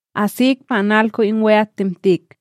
Asik pa analko in we'atTemtik,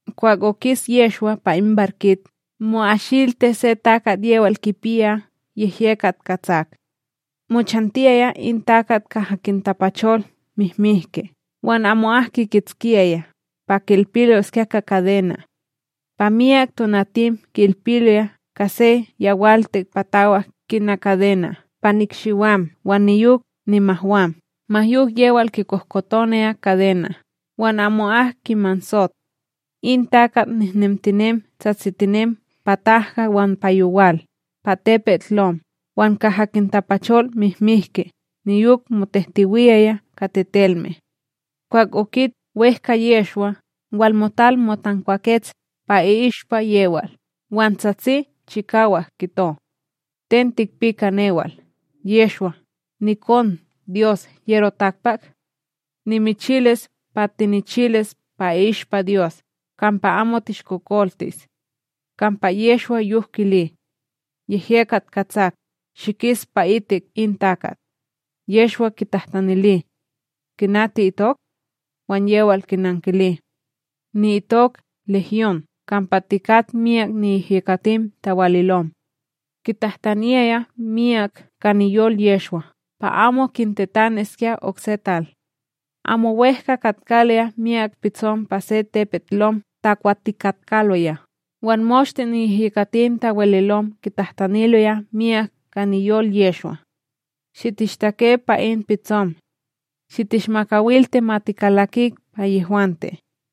Kwah okis Yehshwa pa in barkit, mo'ashilti se takat yewal kipiya yehyekat katsak. Mochantiyaya in takat kaha kintapachol mihmihki wan amo'ak kikitskiyaya, pa ki'ilpiskya ka kadena'. Pa myak tonatim ki'ilpiloya ka se yawaltik patawak kina kadena' pa nikshiwam wan niyok nimahwam, ma yok yewal kikohkotonaya kadena' wan amo'ak kimansot. In takat nehnemtinem tsatsitinem pa tahka wan pa yowal, pa tepetLom wan kaha kintapachol mihmihki, niyok motehtewiyaya ka tetelme. Kwah okit wEhka Yehshwa, walmotal motankwakets pa i'ishpa yewal, wan tsatsi chikawak kito: ―Ten tikpi ka newal, Yehshwa, nikonDyos HyeroTakpak? Nimichilis pa tinichilis pa i'ishpa Dyos kampa amo tishkokoltis. Kampa Yehshwa yok kili: ―Yehyekat katsak, shikis pa'itik in takat! Yehshwa kitahtanili: ―Kina ti'itok? Wan yewal kinankili: ―Ni'itok Legyon, kampa tikat myak niyehyekatim tawalilom. Kitahtaniyaya miyak ka niyol Yehshwa pa amo kintetaniskya okse tal. Amo wEhka katkaloya myak pitsom pa se tepetLom takwatikatkaloya, wan moshte niyehyekatim tawalilom kitahtaniloya miyak ka niyol Yehshwa: ―Shitishtake pa in pitsom; shitishmakawilti ma tikalakik pa yehwante.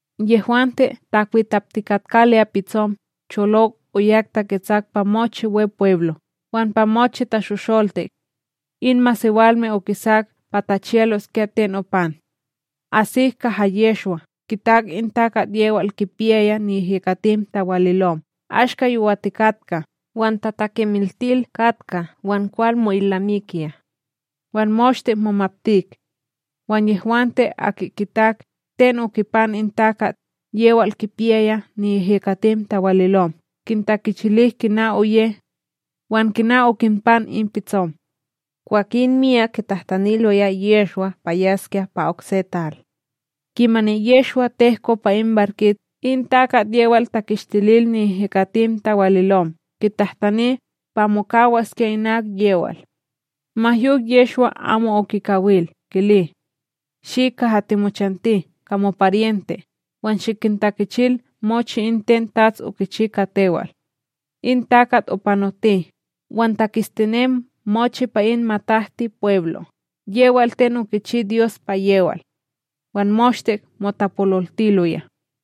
Yehwante takwitaptikatkaloya pitsom, cholok oyak taketsak pa mochi Wepweblo wan pa mochi tashosholtik. In masewalme okisak pa tachiyaloskya ten opan. Asik kaha Yehshwa, kitak in takat yewal kipiyaya niyehyekatim tawalilom, ashka yowatikatka, wan tatakemiltil katka wan kwal mo'ilnamikiya; wan moshte momaptik. Wan yehwante aki kitak, ten okipan in takat yewal kipiyaya niyehyekatim tawalilom, kintakichilik kina oye wan kina okinpan in pitsom. Kwakin miyak kitahtaniloya Yehshwa pa yaskya pa okse tal. Kimani Yehshwa tehko pa in barkit, in takat yewal takishtilil niyehyekatim tawalilom kitahtani pa mokawaskya inak yewal. Ma yok Yehshwa amo okikawil, kili: ―Shi kaha timochanti, ka moparyente, wan shikintakichil mochi in ten TATS okichi ka tewal. In takat opanoti, wan taketstinem mochi pa in MatahtiPweblo'b yewal ten okichi Dyos pa yewal; wan moshte motapololtiloya.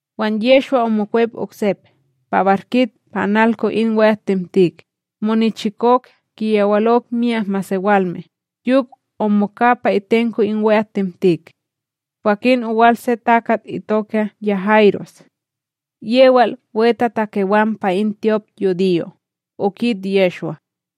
Wan Yehshwa omokwep oksep pa barkit pa analko in we'atTemtik, monichikok kiyawalok myak masewalme, yok omoka pa itenko in we'atTemtik. Kwakin owal se takat itoka Ya'iros; yewal wetatakewan pa in tyopYudiyo, okit Yehshwa,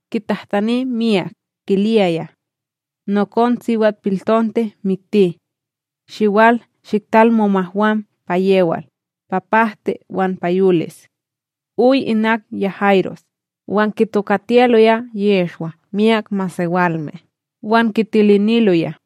kitahtani miyak, kiliyaya: ―Nokon siwatPiltonte mikti; Shiwal shiktal momahwam pa yewal, pa pahti wan pa yolis. Oy inak Ya'iros, wan kitokatiyaloya Yehshwa myak masewalme, wan kitiliniloya.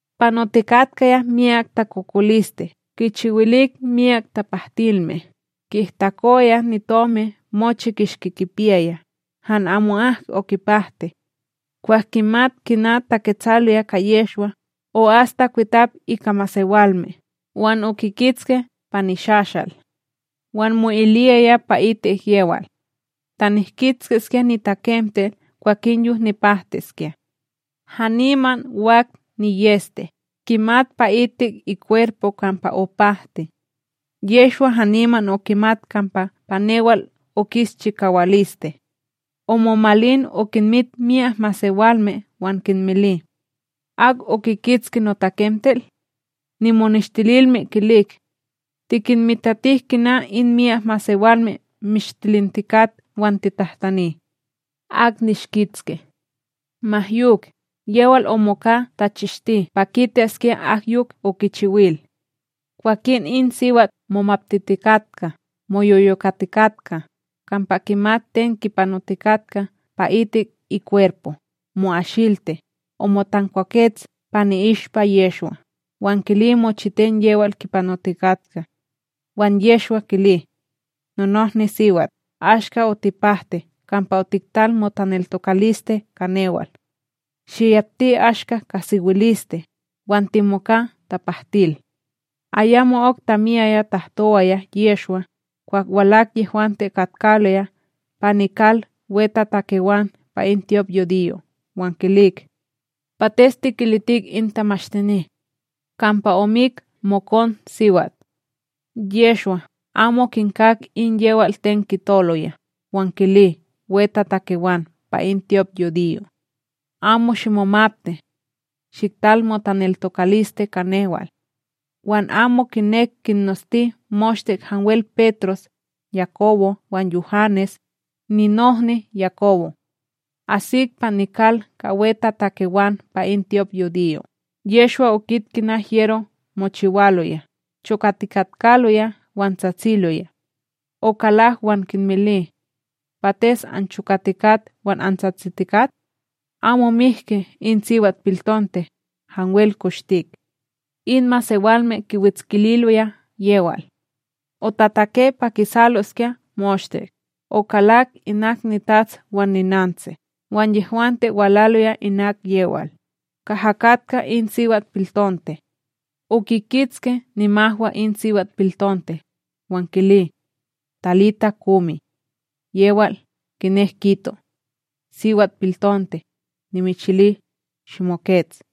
Panotikatka miyak takokoliste kichiwilik myak tapahtinilme, ki'ihtakowaya nitomi mochi kishki kipiyaya, han amo'ak okipahti. Kwah kimat kina taketsaloya ka Yehshwa, o'as takwitap ika masewalme, wan okikitski pa nishashal. Wan mo'iliyaya pa'itik yewal: “Ta nihkitskiskya nitakemtel, kwakin yok nipahtiskya.” Haniman wak niyEste, kimat pa'itik ikwerpo kampa opahti. Yehshwa haniman okimat kampa pa newal okis chikawaliste; omomalin okinmit myak masewalme wan kinmili: ―Ak okikitski notakemtel? Nimoneshtililme kilik: ―Tikinmitatik kina in myak masewalme mishtilintikat wan titahtani: “Ak nishkitski?” Ma yok, yewal omoka tachishti pa kitaskya ak yok okichiwil. Kwakin in siwat momaptitikatka, moyoyokatikatka, kampa kimat ten kipanotikatka pa'itik ikwerpo, mo'ashilti, omotankwakets pa ni'ishpa Yehshwa, wan kili mochiten yewal kipanotikatka. Wan Yehshwa kili: ―NonohniSiwat, ashka otipahti kampa otiktal motaneltokaliste ka newal. Shiyapti ashka ka sewiliste, wan timoka tapahtil. Ayamo'ok tamiyaya tahtowaya Yehshwa, kwah walak yehwante katkaloya pa nikal wetatakewan pa in tyopYudiyo wan kilik: ―Pates tikilitik in tamashtini; kampa omik mokonsiwat? Yehshwa, amo kinkak in yewal ten kitoloya, wan kili wetatakewan pa in tyopYudiyo: ―Amo shimomapti; shiktal motaneltokaliste ka newal. Wan amo kinek kinnosti moshte hanwel Petros, Yakobo wan Yuhanes, ninohni Yakobo. Asik pa nikal ka wetatakewan pa in tyopYudiyo, Yehshwa okit kina hyero mochiwaloya, chokatikatkaloya wan tsatsiloya. Okalak wan kinmili: ―Pates anchokatikat wan antsatsitikat? Amo mihki in siwatPiltonte, hanwel koshtik. In masewalme kiwetskililoya yewal. Otatake pa kisaloskya moshte, okalak inak nitats wan ninantsi wan yehwante walaloya inak yewal, kaha katka in siwatPiltonte. Okikitski nimahwa in siwatPiltonte, wan kili: ―Talita, kumi ―yewal kinek kito: SiwatPiltonte, nimichili, shimokets.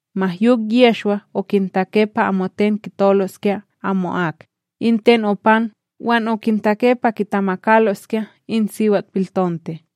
Ma yok Yehshwa okintake pa amoten kitoloskya amo'ak, in ten opan wan okintake pa kitamakaloskya in siwatPiltonte.